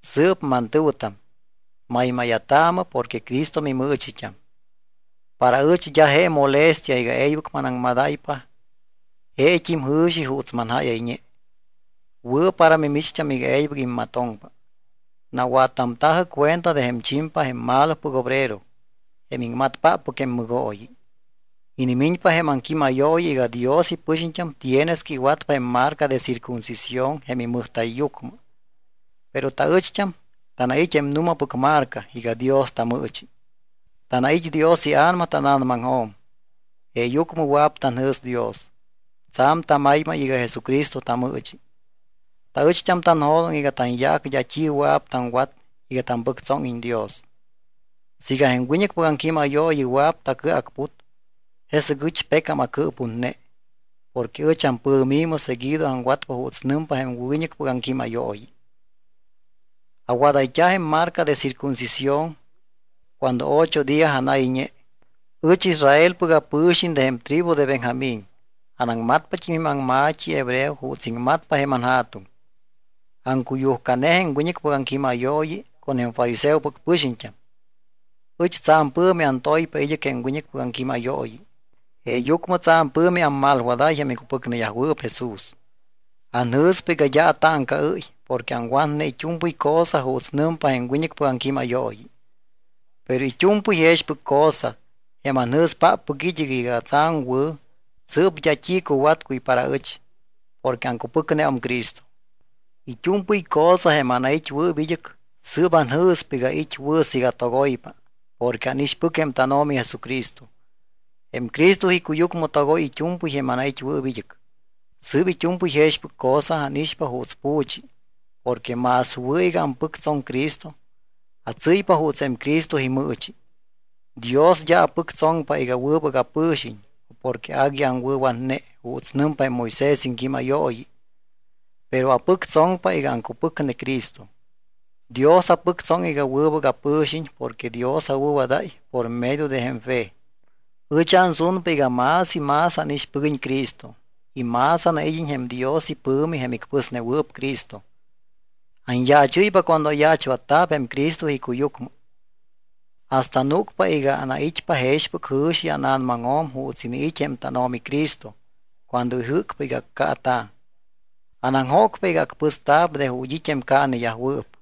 Sɨɨp mantɨ̱wɨtam, maymáya̱taamɨ porque Cristo mimɨɨchit́am. Para ɨch d́a je molestia iga e̱ybɨc manaŋmadáypa jeet́im jɨ̱xi juuts manjáyayñe. Wɨ̱ para mimicht́am iga e̱ybɨc immatoŋpa. Nawattamta̱jɨ cuenta de jém chimpa, jém malopɨc obrero, jém iŋmatpáppɨc jém mɨgooyi. Inimiñpa jém aŋquímayooyi iga Dios ipɨxiñt́am tienes que iwatpa jém marca de circuncisión jém imɨjta̱yyucmɨ. Pero taɨcht́am tanait́ jém nu̱mapɨc marca iga Dios tamɨɨchi. Tanait́ Dios iA̱nama tána̱namaŋjo̱m jeeyucmɨ wɨa̱p tanjɨ̱s Dios. Tsa̱m tamaymay iga Jesucristo tamɨɨchi. Taɨchtam tanjo̱doŋ iga tanyaac d́a t́i wɨa̱p taŋwat iga tapɨctsóŋiñ Dios. Siiga jém wiñɨcpɨc aŋquímayooyi wɨa̱p tacɨacput, jesɨc ɨch pecam acɨɨputne, porque ɨch ampɨ̱mi̱mɨ seguido aŋwatpa juuts nɨmpa jém wiñɨcpɨc aŋquímayooyi. Awadayt́a̱ jém marca de circuncisión cuando ocho día anayñe. Ɨch Israelpɨc apɨ̱xiñ de jém tribu de Benjamín. Anaŋmatpat́im jém aŋma̱t́i hebreo juuts iŋmatpa jém anja̱tuŋ. Aŋcuyujcane jém wiñɨcpɨc aŋquímayooyi con jém fariseopɨc pɨxiñt́am. Ɨch tsa̱m pɨ̱mi antoypa id́ɨc jém wiñɨcpɨc aŋquímayooyi. Jeeyucmɨ tsa̱m pɨ̱mi ammalwadáy jém icupɨcneyajwɨɨp Jesús. Anjɨ̱spa iga d́a atáŋcaɨ́y porque aŋwatne it́u̱mpɨy cosa juuts nɨmpa jém wiñɨcpɨc aŋquímayooyi. Pero it́u̱mpɨy jexpɨc cosa, jém anjɨ̱spáppɨc id́ɨc iga tsa̱m wɨ̱, sɨɨp d́a t́i cuwatcuy para ɨch porque aŋcupɨcneum Cristo. It́u̱mpɨy cosa jém anait́wɨɨp id́ɨc sɨɨp anjɨ̱spa iga it́ wɨ̱ siiga togoypa porque ánixpɨc jém tánO̱mi Jesucristo. Jém Cristo icuyucmɨ togoy it́u̱mpɨy jém anait́wɨɨp id́ɨc, sɨɨp it́u̱mpɨy jexpɨc cosa ánixpa juuts pu̱chi porque más wɨ̱ iga ampɨctsoŋ Cristo, atsɨ́ypa juuts jém Cristo imɨɨchi. Dios d́a apɨctsoŋpa iga wɨbɨc apɨ̱xiñ o porque agui aŋwɨ̱watne juuts nɨmpa jém Moisés iŋquímayooyi, pero apɨctsoŋpa iga aŋcupɨcne Cristo. Dios apɨctsoŋ iga wɨbɨc apɨ̱xiñ porque Dios awɨ̱wadáy por medio de jém fe. Ɨch ansunpa iga más y más ánixpɨguiñ Cristo y más anaid́iñ jém Dios ipɨ̱mi jém icpɨsnewɨɨp Cristo. Anyaachɨ́ypa cuando ayaachwatta̱p jém Cristo icuyucmɨ. Hasta núcpa iga anait́pa jexpɨc jɨ̱xi ána̱namaŋjo̱m juuts iniit́ jém tánO̱mi Cristo cuando ijɨ́cpa iga accaata̱. Anaŋjócpa iga acpɨsta̱p de ju̱t́ it́ jém caaneyajwɨɨp.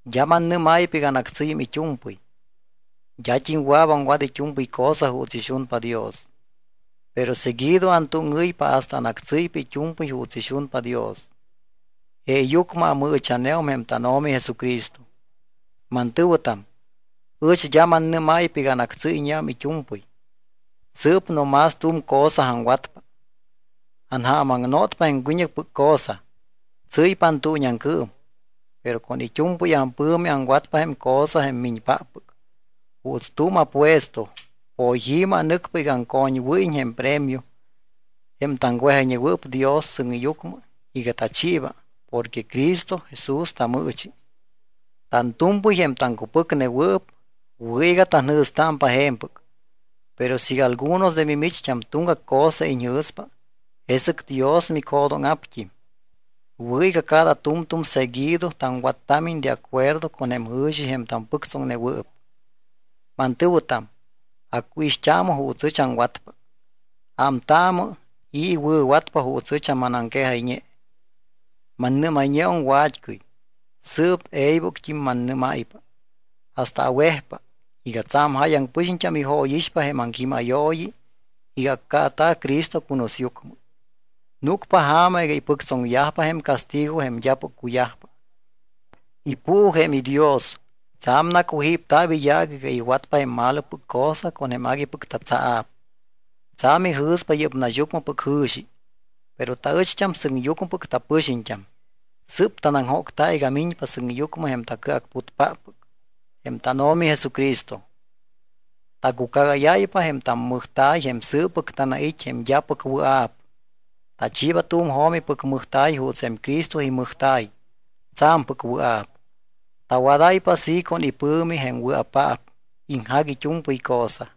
D́a mannɨ́máypa iga anactsɨ́yum it́u̱mpɨy. D́at́im wɨa̱p aŋwat it́u̱mpɨy cosa juuts ixunpa Dios, pero seguido antúŋɨ́ypa hasta anactsɨ́ypa it́u̱mpɨy juuts ixunpa Dios. Jeeyucmɨ amɨɨcha̱neum jém tánO̱mi Jesucristo. Mantɨ̱wɨtam, ɨch d́a mannɨ́máypa iga anactsɨ́yñeum it́u̱mpɨy. Sɨɨp no más tu̱m cosa aŋwatpa. Anja̱mnotpa jém wiñɨcpɨc cosa, tsɨ́ypa antuuñiaŋcɨɨm, pero con it́u̱mpɨy ampɨ̱mi aŋwatpa jém cosa jém miñpáppɨc. Juuts tu̱m apuesto, poyi̱mɨ anɨcpa iga aŋcoñwɨ́yiñ jém premio, jém taŋwejayñewɨɨp Dios sɨŋyucmɨ iga tachiiba porque Cristo Jesús tamɨɨchi. Tantu̱mpɨy, jém taŋwɨ̱cupɨcnewɨɨp, wɨ̱ iga tanjɨ̱stámpa je̱mpɨc. Pero siiga algunos de mimicht́am tuŋgac cosa iñjɨ̱spa, jesɨc Dios micjo̱dóŋa̱pt́im. Wɨ̱ iga cada tu̱mtu̱m seguido taŋwattámiñ de acuerdo con jém jɨ̱xi jém tampɨctsoŋnewɨɨp. Mantɨ̱wɨtam, acuixt́aamɨ juuts ɨch aŋwatpa. Ámtaamɨ i̱ iwɨ̱watpa juuts ɨch manaŋquejayñe. Mannɨ́mayñeum wa̱t́cɨy, sɨɨp e̱ybɨct́im mannɨ́máypa hasta awejpa, iga tsa̱m jáyaŋ pɨxiñt́am ijóyixpa jém aŋquímayooyi iga accaata̱ Cristo cunusyucmɨ. Núcpa ja̱ma iga ipɨctsoŋyajpa jém castigo jém d́apɨc cuyajpa. Ipuu jém idios. Tsa̱m nacujípta̱p iyaac iga iwatpa jém malopɨc cosa jém aguipɨc tatsaa̱p. Tsa̱m ijɨ̱spa yɨ́p naxyucmɨpɨc jɨ̱xi. Pero taɨcht́am sɨŋyucmɨpɨc tapɨxiñt́am. Sɨ́p tanaŋjócta iga miñpa sɨŋyucmɨ jém tacɨacputpáppɨc, jém tánO̱mi Jesucristo. Tacucagáyáypa jém tammɨjta̱y jém sɨɨppɨc tanait́ jém d́apɨc wɨa̱p. Tachiiba tu̱m jo̱mipɨc mɨjta̱y juuts jém Cristo imɨjta̱y tsa̱mpɨc wɨa̱p. Tawadáypa así con ipɨ̱mi jém wɨa̱paap iŋjac it́u̱mpɨy cosa.